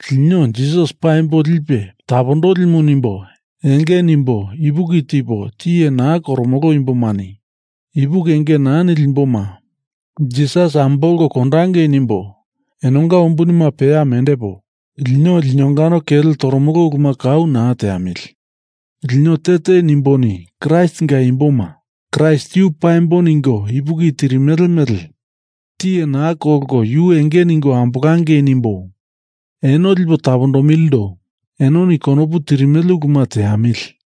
Lino Jisas paimbo lipe tapondolimu nimbo enge nimbo ipuki tipo tiye naa koromolo imbomani ipuki enge naa nili imboma Jisas ambolko kondangei nimbo enonga umbunima peya mendepo, lino linongano kele toromolo uluma kau naa teamili. Lino te te nimboni Kraistinga imboma Kraist yu paimbo ningo ipuki tirimele mele tiye naa kolko yu enge ningo ambolangei nimbo eno lipo tapondomilindo enoni konopu tirimele uluma teamili.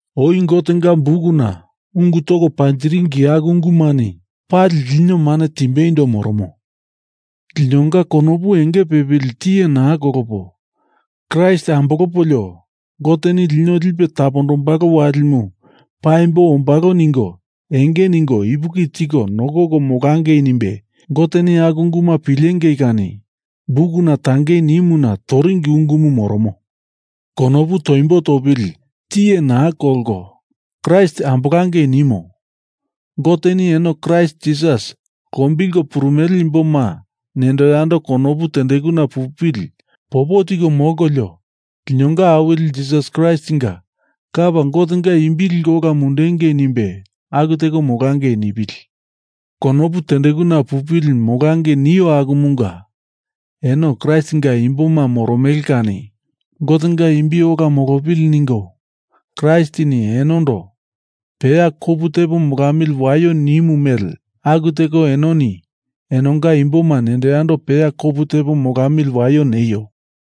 Oi Gotenga bukuna ungu toko panjiringi aku ungumani pali lino mane timbeindo moromo. Linonga konopu enge pepili tiye naa kolopo Kraist ambolopolio Goteni lino lipe tapondombalo walimu paimbo ombalo ningo enge ningo ipuki tiko nokoko molangei nimbe Goteni aku unguma pilengei kani bukuna tangei nimuna toringi ungumu moromo. Konopu toimbo topili tiye naa kolko Kraist ambolangei nimo Goteni eno Kraist Jisas lombilko purumele imboma nendo yando konopu tendekuna pupili popo tiko molkolio, linonga Awili Jisas Kraistinga Lapa Gotenga imbi liko ola mundengei nimbe aku teko molangei nipili. Konopu tendekuna pupili molangei nio akumunga, eno Kraistinga imboma moromele kani Gotenga imbi ola molopili ningo Kraistini enondo peya kopu tepo molamili waio nimu mele aku teko enoni enonga imboma nendo yando peya kopu tepo molamili waio neio.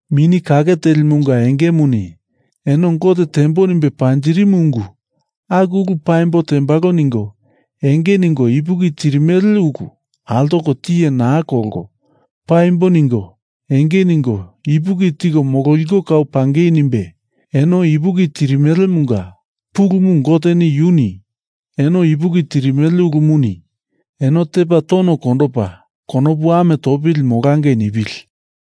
Mini Kake Telimunga engemuni eno Gote tembo nimbe panjirimu ungu aku ulu paimbo tembalo ningo enge ningo ipuki tirimele ulu altoko tiye naa kolko paimbo ningo enge ningo ipuki tiko mololiko kau pangei nimbe, eno ipuki tirimelemunga pulumu Gote yuni eno ipuki tirimele ulumuni eno tepa tono kondopa konopu ame topili molangei nipili.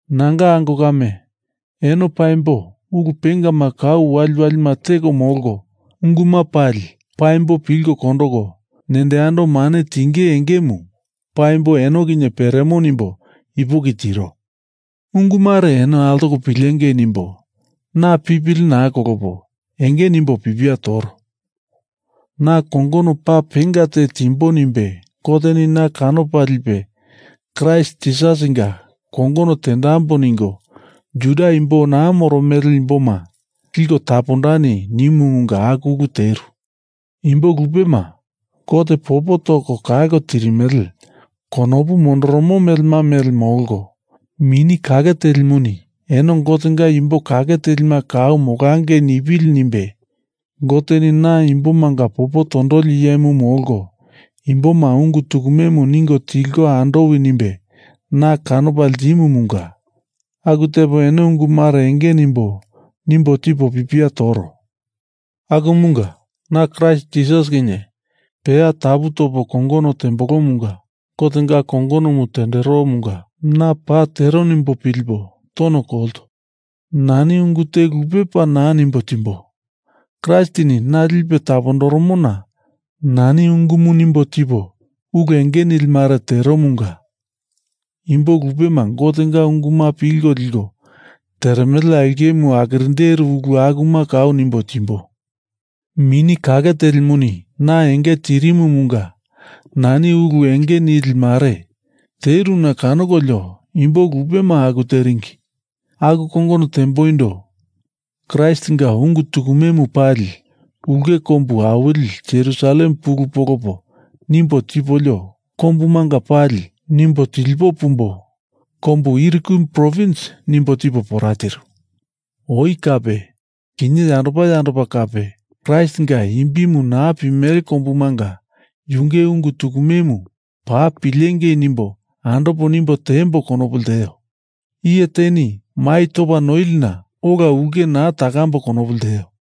Nanga ango kame, eno paimbo ulu pengama kau waliwalima teko molko, unguma pali paimbo pilko kondoko, nendo yando mane tinge engemu paimbo eno kinye peremo nimbo ipuki tiro. Ungu mare eno altoko pilengei nimbo na pipili naa kolopo enge nimbo pipia toro. Na kongono paa penga te timbo nimbe Goteni na kanopa lipe Kraist Jisasinga kongono tendambo ningo Juda imbo naa moromele imboma liko tapondani nimumunga aku ulu teru. Imbo lupema Gote popo toko kalko tirimele konopu mondoromo melema mele molko, Mini Kake Telimuni eno Gotenga imbo kake telima kau molangei nipili nimbe Goteni na imbomanga popo tondoli iyemu molko imboma ungu tukumemu ningo tilko andowi nimbe na kanopa ltimumunga aku tepo eno ungu mare enge nimbo, nimbo tipo pipia toro. Akumunga na Kraist Jisas kinye peya tapu topo kongono terembolomunga Gotenga kongonomu tenderomunga na paa tero nimbo pilipo tono kolto. Nani ungu te lupe paa naa nimbo timbo. Kraistini na lipe tapondoromona nani ungumu nimbo tipo ulu enge nili mare teromunga imbo lupema Gotenga unguma pilko liko teremele aulkemu akirinderu ulu akuma kau nimbo timbo. Mini Kake Telimuni na enge tirimumunga nani ulu enge nili mare teruna kanokolio imbo lupema aku teringi. Aku kongono temboindo Kraistinga ungu tukumemu pali ulke kombu awili Jerusalem pulu polopo nimbo tipolio kombumanga pali nimbo tilipo pumbo kombu Ilirikum provins nimbo tipo pora tiru. Oi kape kinye yandopa yandopa kape, Kraistinga imbimu naa pimele kombumanga yunge ungu tukumemu paa pilengei nimbo andopo nimbo tiemboi konopu lteo. Iye teni mai topa noilina ola ulke naa takambo konopu lteo.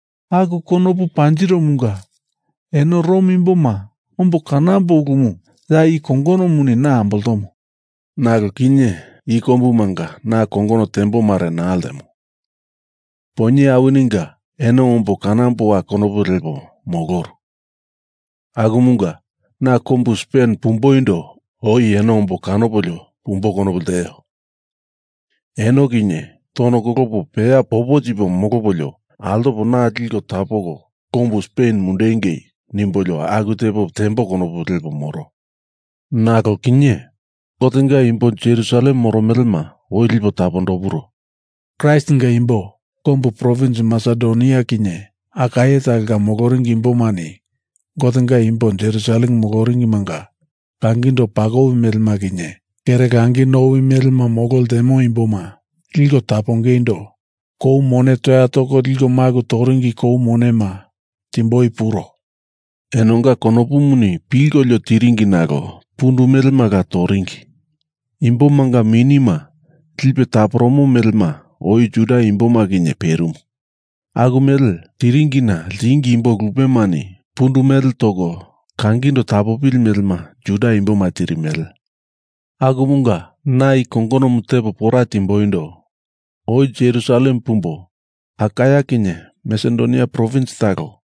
Aku konopu panjiromunga eno Rom imboma ombo kanombo ulumu ya i kongonomuni na amboltomo. Nalo kinye i kombumanga na kongono tembo mare naa ltemo. Poinye awininga eno ombo kanamboa konopu lepo moloru, akumunga na kombu Spen pumboindo oi eno ombo kanopolio pumbo konopu lteo. Eno kinye tono kolopo peya popo tipo molopolio altopo na liko tapoko kombu Spen mundupengei nimbolio aku tepo tembo konopu lepo moro. Nalo kinye Gotenga imbo Jerusalem moromelema oi lipo tapondopuro. Kraistinga imbo kombu provins Masedonia kinye Akaia talonga moloringi imbomani Gotenga imbo Jerusalem moloringimanga kangindo pakowi melema kinye kere langi nowi melema molo ltemo imboma liko tapongeindo kou mone toya toko liko maku toringi kou monema timboi puro. Enonga konopuni pilkolio tiringi nalo pundu melela toringi. Imbomanga minima lipe taporomo melema oi Juda imboma kinye perimu. Aku mele tiringina ltingi imbo lupemani pundu mele toko kangindo tapopili melema Juda imboma tirimele. Akumunga na i kongonomu tepo pora timboindo oi Jerusalem pumbo kombu Akaia kinye Masedonia provins talo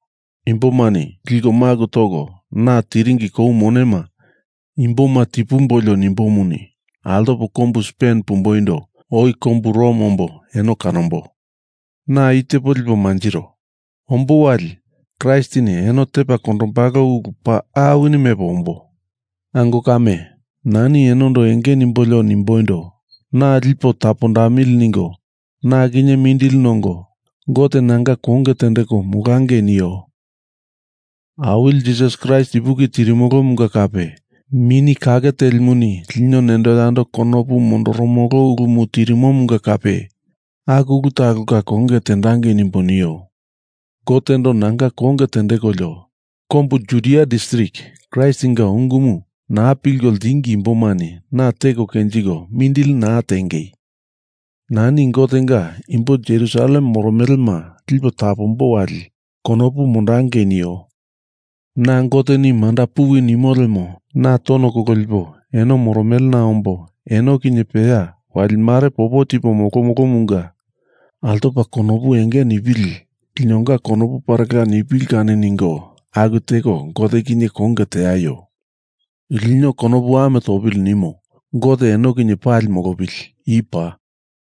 imbomani liko maku toko na tiringi kou monema imboma tipumbolio nimbomuni, altopo kombu Spen pumboindo oi kombu Rom ombo eno kanombo. Na i tepo lipo manjiro. Ombo wali Kraistini eno tepa kondombalo ulu paa awini mepo ombo. Ango kame, nani enondo enge nimbolio nimboindo, na lipo tapondamili ningo na kinye mindili nongo Gote nanga konge tendeko molangei nio. Awili Jisas Kraist ipuki tirimolomunga kape, Mini Kake Telimuni lino nendo yando konopu mondoromolo ulumu tirimomunga kape, aku ulu talonga konge tendangei nimbo nio. Gotendo nanga konge tendekolio, kombu Judia distrik Kraistinga ungumu naa pilko ltingi imbomani na teko kenjiko mindili naa tiengei. Nani Gotenga imbo Jerusalem moromelema lipo tapombo wali konopu mondangei neio. Na Goteni Manda, puwi nimo lemo na tono kololipo eno moromelena ombo eno kinye peya wali mare popo tipo molomolomunga altopa konopu enge nipili linonga konopu parela nipili kani ningo aku teko Gote kinye konge teaio. Lino konopu ame topili nimo Gote eno kinye pali molopili. I paa.